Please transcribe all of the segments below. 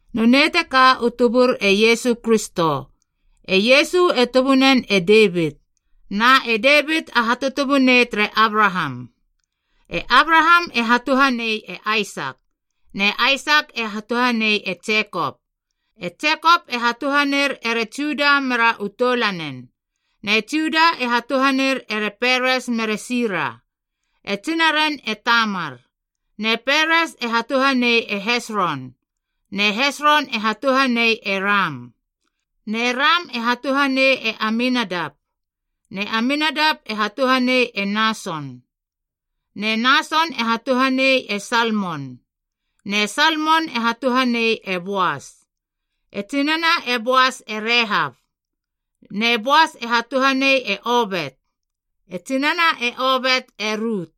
Nonei teka u tubur e Iesu Kristo. E Iesu e tubunen e Devit, na e Devit a hatutubunei tere Abraham. E Abraham e hatuhanei e Aisak. Ne Aisak e hatuhanei e Jekop. E Jekop e hatuhaner ere Juda mera u toulanen. Ne Juda e hatuhaner ere Peres mere Sira. E tsinaren e Tamar. Ne Peres e hatuhanei e Hesron. Ne Hesron e hatuhanei e Ram. Ne Ram e hatuhanei e Aminadap. Ne Aminadap e hatuhanei e Nason. Ne Nason e hatuhanei e Salmon. Ne Salmon e hatuhanei e Boas. E tsinana e Boas e Rehap. Ne Boas e hatuhanei e Obet. E tsinana e Obet e Rut.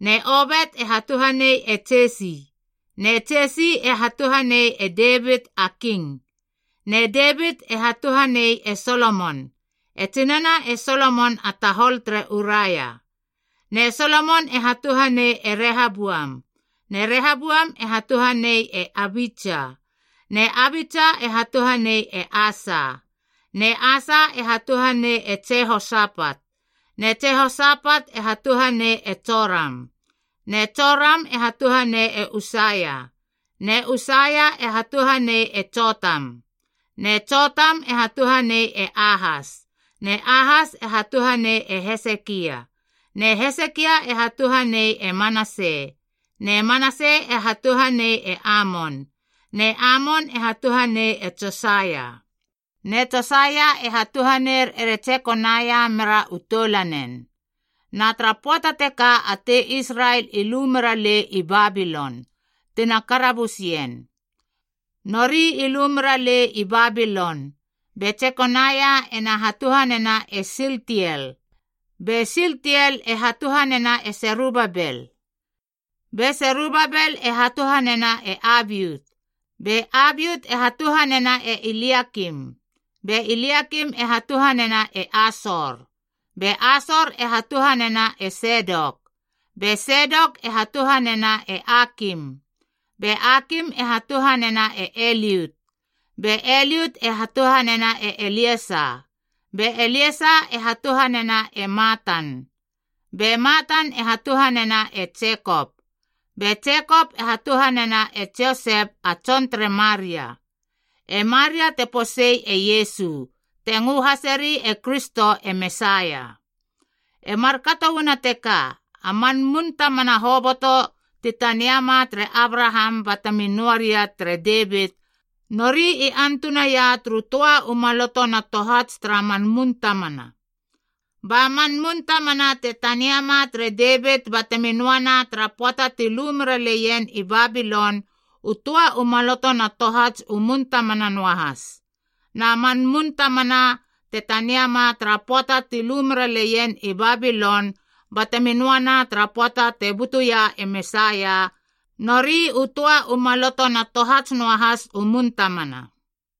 Ne Obet e hatuhanei e Jesi. Ne Jesi e hatuhanei e Devit a king. Ne Devit e hatuhanei e Solomon. E tsinana e Solomon a tahol tere Uraia. Ne Solomon e hatuhanei e Rehaboam. Ne Rehaboam e hatuhanei e Abitsa. Ne Abitsa e hatuhanei e Asa. Ne Asa e hatuhanei e Jihosapat. Ne Jihosapat e hatuhanei e Joram. Ne Joram e hatuhanei e Usaia. Ne Usaia e hatuhanei e Jotam. Ne Jotam e hatuhanei e Ahas. Ne Ahas e hatuhanei e Hesekia. Ne Hesekia e hatuhanei e Manase. Ne Manase e hatuhanei e Amon. Ne Amon e hatuhanei e Josaia. Ne Josaia e hatuhaner ere Jekonaia mera u toulanen. Na tara pöata teka a tei Israel i lu meralei i Babilon, tina karabusien. Nori i lu meralei i Babilon, be Jekonaia ena hatuhanena e Sieltiel. Be Sieltiel e hatuhanena e Serubabel. Be Serubabel e hatuhanena e Abiut. Be Abiut e hatuhanena e Eliakim. Be Eliakim e hatuhanena e Asor. Be Asor e hatuhanena e Sedok. Be Sedok e hatuhanena e Akim. Be Akim e hatuhanena e Eliut. Be Eliut e hatuhanena e Eliasa. Be Eliasa e hatuhanena e Matan. Be Matan e hatuhanena e Jekop. Be Jekop e hatuhanena e Josep a tson tere Maria. E Maria te posei e Iesu, te ngö haseri e Kristo e Mesaia. E markato uana teka, a man mun tamana hoboto ti taniama tere Abraham batemi noa ria tere Devit, nori i antunaia turu töa u maloto na tohats tara man mun tamana. Ba man mun tamana te taniama tere Devit batemi noana tara pöata ti lu mera leien i Babilon, u töa u maloto na tohats u mun tamana noahas. Na man mun tamana te taniama tara pöata ti lu mera leien i Babilon batemi noana tara pöata te butuia e Mesaia, nori u töa u maloto na tohats noahas u mun tamana.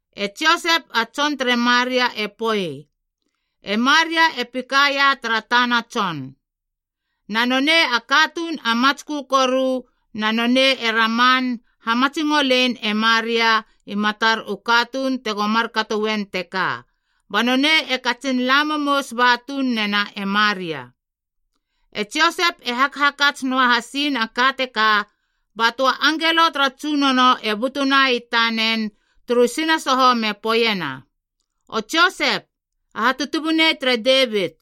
E Josep a tson tere Maria e poei, e Maria e pikaia tara tana tson. Na nonei a katuun a matskö koru na nonei e raman hamatsingolein e Maria i matar u katuun tego markato uen teka, ba nonei e katsin la momous ba tuun nena e Maria. E Josep e hakhakats noa hasin a ka teka, ba töa angelo tara Tsunono e butuna i tanen turu sinasoho me poeiena, “O Josep, a hatutubunei tere Devit,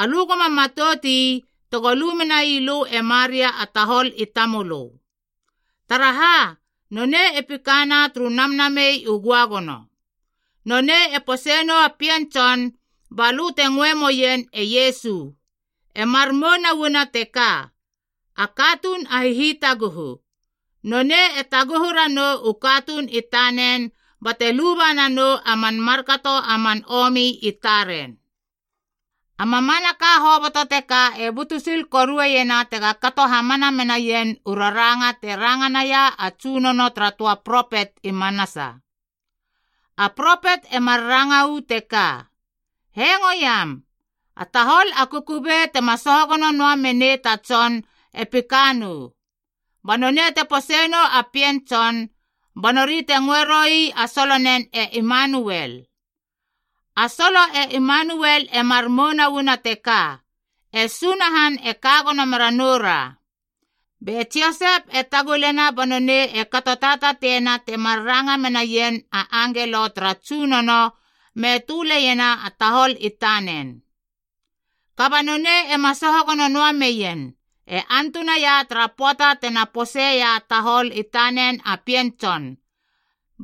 alö goma matout ii tego lu menai lö e Maria a tahol i tamölö. Taraha, nonei e pikana turu Namnamei u Göagono. Nonei e pose nou a pien tson, balö te ngöe moien e Iesu, e mar mouna uana teka, A Katuun a Hihitaguhu. Nonei e taguhu ranou u katuun i tanen bate luba nanou a man markato a man omi i taren.” A mamanaka hoboto teka e butu sil korueiena tega kato hamana menaien u raranga te ranga naia a Tsunono tara töa propet i manasa. A propet e mar ranga uu teka: “Hengoiam! A tahol a kukubei tema soho gono noa menei ta tson e pika nou. Ba nonei te pose nou a pien tson, ba nori te ngöe roi a solonen e Emanuel.” A solo e Emanuel e mar mouna uana teka, “E Sunahan e ka gono mera noura.” Be Josep e tagulena ba nonei e kato tatatiena temar ranga menaien a angelo tara Tsunono me töleiena a tahol i tanen. Kaba nonei ema soho gono noa meien, e antunaia tara pöata tena poseia a tahol i tanen a pien tson.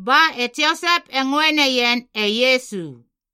Ba e Josep e ngöe neien e Iesu.